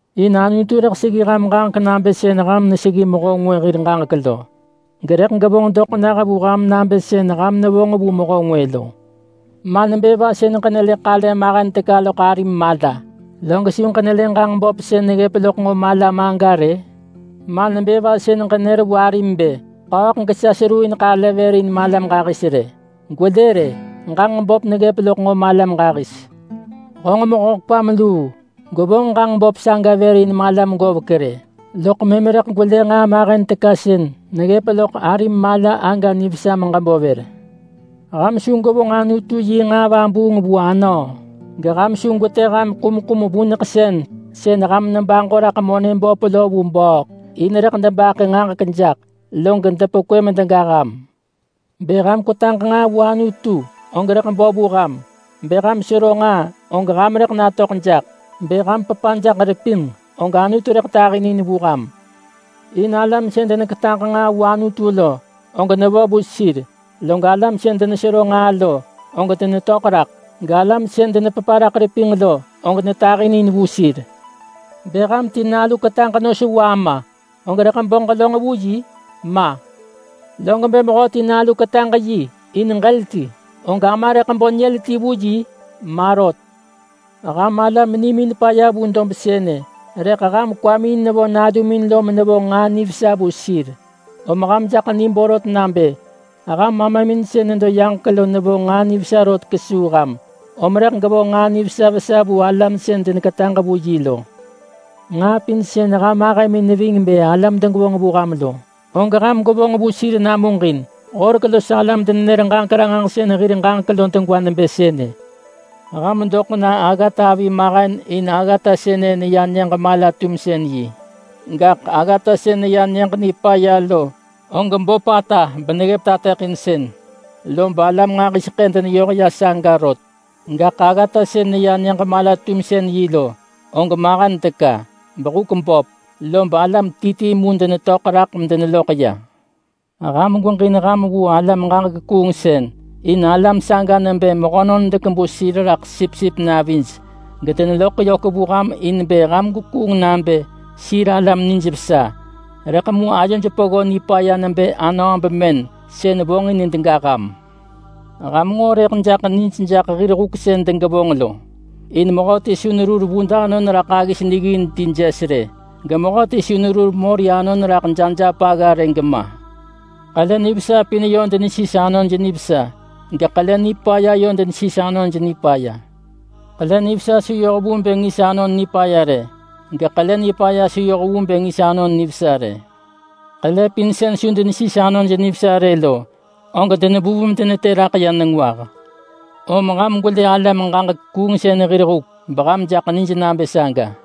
In Anutu rëḳ seggi ham ġaġek nabë sën ham neseggi mehö ngwë hir ġaġek lo. Gerëḳ gevonġ doḳ nah vu ham nabë sën ham nevonġ vu mehö ngwë lo. Ma nebë va sën ġenelë ḳale mahen teka sën negga raḳ arim mala lo, log su ġenelë ġanġ dus ti sën neggëp loḳ malam aga rë-ë? Ma nebë va sën ġenër vu arim bë, ‘Ḳööḳ gesa hevonġ ḳale vër in malam ġahis rë.’ Gwelë rë, ġanġ dus ti neggëp loḳ nġo malam ġahis. Honġ mehö kwam luu! Gwevonġ ġanġ dus ti saga vër in malam govek rë, loḳ mëm rëḳ gwelë nġaa mahen teka sën neggëp loḳ arim mala aga nivesa meġebo vër. Ham su gwevonġ Anutu yi nġaa vabuung vu anöö! Geham su gwetë ham nġaa vuneḳsën sën ham nebaġo raḳ monë böp lo na vu bööḳ. In rëḳ debaḳë duḳ dob jaḳ vahaj, log depekwë medega ham.” “Bë ham kwetaġ nġaa vu Anutu og rëḳ bo vu ham, bë ham sero nġaa, og ham rëḳ natöḳ jaḳ, bë ham pepa jaḳ repinġ, og Anutu rëḳ tahinin vu ham. In alam sën deneketaġ nġaa vu Anutu lo, og nevo vu sir, log alam sën denesero nġaa lo, og denetöḳ raḳ, galam sën denepepa raḳ repinġ lo, og netahinin vu sir. Bë ham ti nalu ketaġ nos vu ama, og rëḳ bo ġelönġ vu yi? Ma! Log bë mehöti nalu ketaġ yi in ġël ti, og ama rëḳ bo nyël ti vu yi? Ma rot! Ham alam nimin paya vu dob sënë, rëḳ ham kwamin nevo nalumin lo menevonġ nġaa nivesa vu sir, om ham jaḳ ni borot nabë ham Amamin sën nedo yaġek lo nevonġ nġaa nivesa rot kesuu ham, om rëḳ gevonġ nġaa nivesa vesa vu alam sën deneketaġ vu yi lo. Nġaa pin sën ham ahëmin neving bë alam degevonġ vu ham lo, og ham gwevonġ vu sir namuġin. Horek los alam denenër-ġaġek-ranġahsën hir ġaġek lo degwa nebë sënë.” “Ham doḳ na aggata avi mahen in aggata sënë neya Nyëġ Mala-tumsën-yi. Gaḳ aggata sën neya Nyëġ Nipaya lo, og böpata beneggëp tateḳinsën, lob alam nġahiseḳë deneyoh ya saga rot. Gaḳ aggata sën neya Nyëġ Mala-tumsën-yi lo, og mahen teka, behuk böp, lob alam ti ti mu denetöḳ raḳ medeneloḳ ya.” “Ham gweġin ham vu alam-ġaġek-kuungsën. In alam saga nebë mehönon dekebu sir raḳ sipsip navij gedeneloḳ yök vu ham in bë ham gwekuung nabë sir alam nijvesa. Rëḳ mu ayoj peggo nipaya nebë anöö bemën sën vonġin dega ham. Ham nġo rëḳ jaḳ nij jaḳ hir huk sën degevonġ lo. In mehöti su nerur vud anon raḳ aggis niggin ti jes rë, gemehöti su nerur mori anon raḳ jajap rë gema. Ḳele nivesa pin yö nesis anon nivesa, geḳele nipaya yö nesis anon nipaya. Ḳele nivesa su yoh vu bë ngis anon nipaya rë, geḳele nipaya su yoh vu bë ngis anon nivesa rë. Ḳele pin sën su nesis anon nivesa rë lo, og denevuv medenetë raḳ ya nengwah. Om ham gwelë alam-ġaġek-kuungsën hir huk, beham jaḳ nij nabë saga.”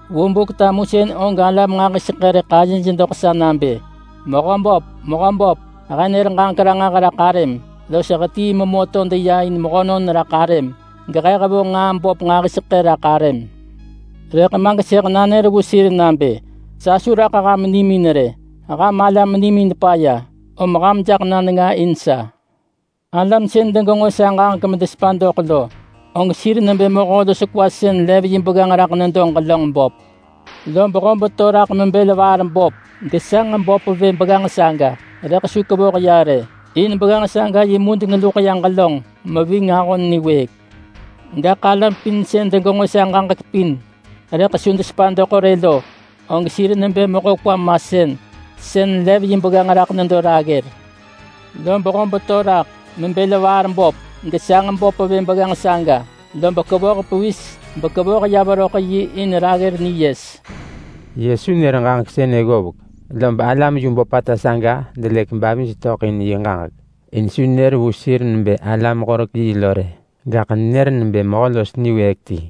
Vu Buk-tamusën og alam nġahiseḳë rëḳ ayej doḳ sa nabë, ‘Mehöböp! Mehöböp! He nër ġaġek ranġah raḳ arëm, los hetii memö to deya in mehönon raḳ arëm, gehe hevonġ nġaa böp nġahiseḳë raḳ arëm!’ Rëḳ ma gesëḳ nanër vu sir nabë, ‘Sa su raḳ ham nimin rë. Ham alam nimin paya, ham jaḳ na nenga in sa!’” “Alam sën degenġo sa ġaġek bedesepa doḳ lo, og sir nebë mehö los kwa sën lev yi begganġ raḳ nedo ġelönġ böp. Lob hob to raḳ mebël vaar böp gesanġ böp vë begganġ saga, rëḳ su kevoh ya rë, in begganġ saga yi mudeng luḳ ya ġelönġ meving ahon niwëëk. Gaḳ alam pin sën degenġo sa ġaġek pin rëḳ su desepa doḳ rë lo, og sir nebë mehö kwa masën, sën lev yi begganġ raḳ nedo raggër. Lob hob to raḳ, mebël vaar böp, gesanġ böp vë begganġ saga, lob kevoh pevis bekevoh ya veröḳ yi in raggër niyes.” Yesu nër ġaġek sënë ggovek, lob alam yu böpata saga delëk bavij töḳ in yi ġaġek, in su nenër vu sir nebë alam-horek-yi lo rë. Gaḳ nenër nebë mehö los niwëëk ti.